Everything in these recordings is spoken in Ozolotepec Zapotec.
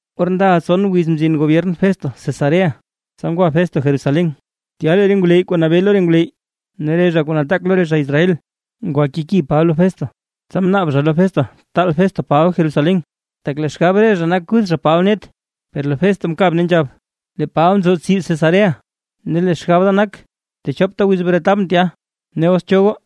Or ndaʼa tson wiz mzin gobyern Festo Cesarea, tsa ngwa Festo Jerusalén. Tya lee re ngwleyy kuu nabee lo re ngwleyy ne re zha kuu nataak lo re zha Israel, ngwa keki Paba lo Festo. Tsa mnaab zha lo Festo taal Festo Paba Jerusalén. Tak lee xgab re zha nak kuth zha Paba net. Per lee Festo mkab ne nzhab: ―Lee Paba nzo tsib Cesarea, ne lee xgab da nak techopta wiz bretabʼn tya. Ne os cho goo,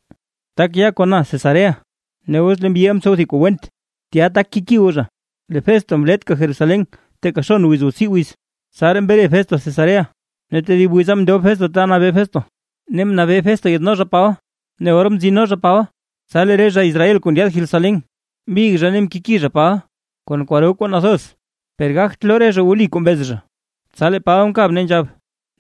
tak ya kon na Cesarea, ne os lee mbyiʼa mtsow thib kuu went, tya tak keki goo zha. Lee Festo mletka Jerusalén teeka xon wiz o tsii wiz, tsaraa mre Festo Cesarea, ne tedib wiza mndob Festo ta nabee Festo, ne mnabee Festo yaadno zha Paba. Ne or mtsino zha Paba, tsa lee re zha Israel kuu ndyaad Jerusalén, mbig zha ne mkeki zha Paba kon kwaro kuu nathoz, per gagt loo re zha wli kuu mbez re zha. Tsa lee Paba mkab ne nzhab: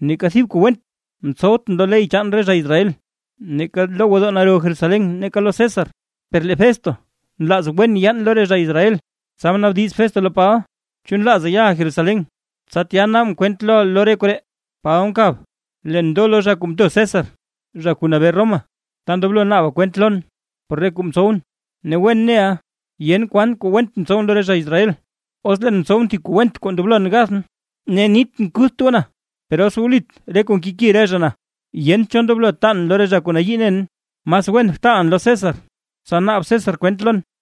―Neeka thib kuu went mtsowtʼn lo ley chaan re zha Israel, neeka lo gwodoo naro Jerusalén ne neeka lo César. Per lee Festo nlaaz wen yaan lo re zha Israel. Tsa mnaabdiz Festo lo Paba: ―¿Chu nlaaza yaʼa Jerusalén, tsa tya naabʼn kwent loʼa lo re koree? Paba mkab ne nzhab: ―Leen ndo lo zha kuu mto César zha kuu nabee Roma, ta ndoblo naaba kwent lon por re kuu mtsowʼn, ne wen neʼa yent kwan kuu went mtsowʼn lo re zha Israel. Os leen mtsowʼn thib kuu went kuu ndoblon gathʼn, ne nitʼn kutht goo na, per os wlit re kuu nkeki re zha na, yent cho ndoblo taan lo re zha kuu nayii nen, mas wen btaalʼn lo César, tsa naab César kwent lon.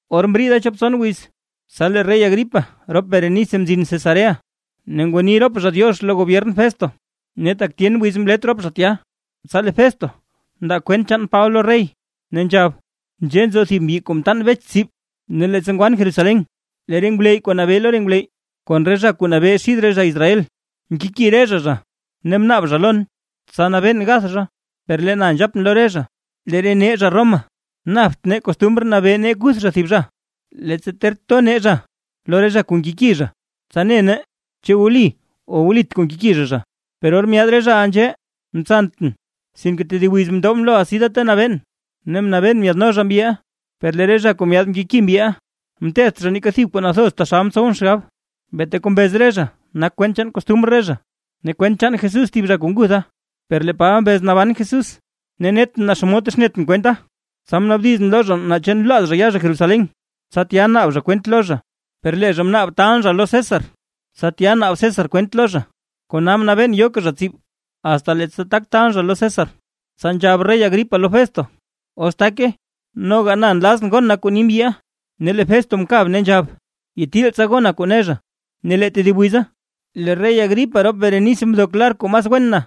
Or mriida chop tson wiz, tsa lee rey Agripa rop Berenice mzin Cesarea ne ngwanii rop zha “diox” lo gobyern Festo. Ne tak tyen wiz mlet rop zha tya, tsa lee Festo mndaa kwent chaan Paba lo rey, ne nzhab: ―Nzhee nzo thib mbyi kuu mtaan Bech tsib. Ne leettsa ngwan Jerusalén, lee re ngwleyy kuu nabee lo re ngwleyy kon re zha kuu nabee xid re zha Israel mkeki re zha zha ne mnaab zha lon, tsa nabeen gath zha. Per lee na nzhap lo re zha: “Lee re nee zha Roma napt nee costumr nabee nee kuth zha thib zha, leettsa ter to nee zha lo re zha kuu nkeki zha, tsa ne nee naa chu wli o wlit kuu nkeki zha zha”. Per or myaad re zhaʼa nzhee, mtsantʼn sinke tedib wiza mndobʼn lo asi da ta nabeen, ne mnabeen myaadno zha mbyiʼa. Per lee re zha kuu myaad mkeki mbyiʼa, mtetht zha neeka thib kuu nathoz taxal mtsowʼn xgab. Beeta kuu mbez re zha nak kwent chaan kostumr re zha, ne kwent chaan Jesús thib zha kuu ngutha, per lee Paba mbez naban Jesús. Ne netʼn naa xomod texnetʼn kwenta, tsa mnaabdizʼn lo zha naa chu nlaaz zha ya zha Jerusalén, tsa tya naab zha kwent lo zha. Per lee zha mnaab taalʼn zha lo César, tsa tya naab César kwent lo zha, kona mnabeen yoka zha tsib, asta leettsa tak taalʼn zha lo César. Tsa nzhab rey Agripa lo Festo: ―Os take noga na nlazʼn gon na kuu ni mbyiʼa. Ne lee Festo mkab ne nzhab: ―Yee tsa gona kuu ne zha. Ne lee tedib wiza lee rey Agripa rop Berenice mdok lar kuu mas wen na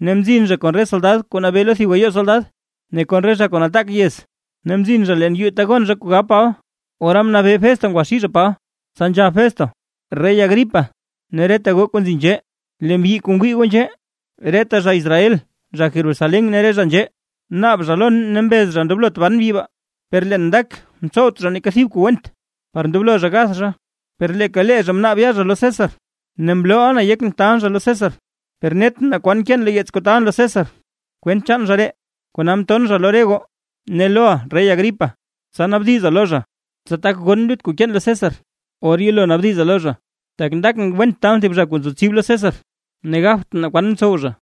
ne mzin zha kon re soldad kuu nabee lo thib gayoo soldad, ne kon re zha kuu nataak yez, ne mzin zha leen yuu ta gon zha kuu gab Paba, ora mnabee Festo ngwaxii zha Paba. Tsa nzhab Festo: ―Rey Agripa, ne reta goo kuu nzi nzhee. Lee mbyi kuu ngwii goo nzhee. Reta zha Israel zha Jerusalén ne re zha nzhee, naab zha lon ne mbez zha ndoblot ban mbyi baa. Per leen ndak mtsowt zha neeka thib kuu went par ndoblo zha gath zha, per leeka lee zha mnaab zha ya zha lo César. Ne mlooʼa na yekʼn taalʼn zha lo César. Per netʼn naa kwan keen lo yeets kuu taalʼn lo César, kwent chaan zha ree, kona mton zha lo re goo, ne loʼa rey Agripa, tsa naabdiza lo zha, tsa tak gon lut kuu keen lo César, or yelo naabdiza lo zha. Tak ndakʼn went taalʼn thib zha kuu nzo tsib lo César ne gabtʼn naa kwan mtsow zha.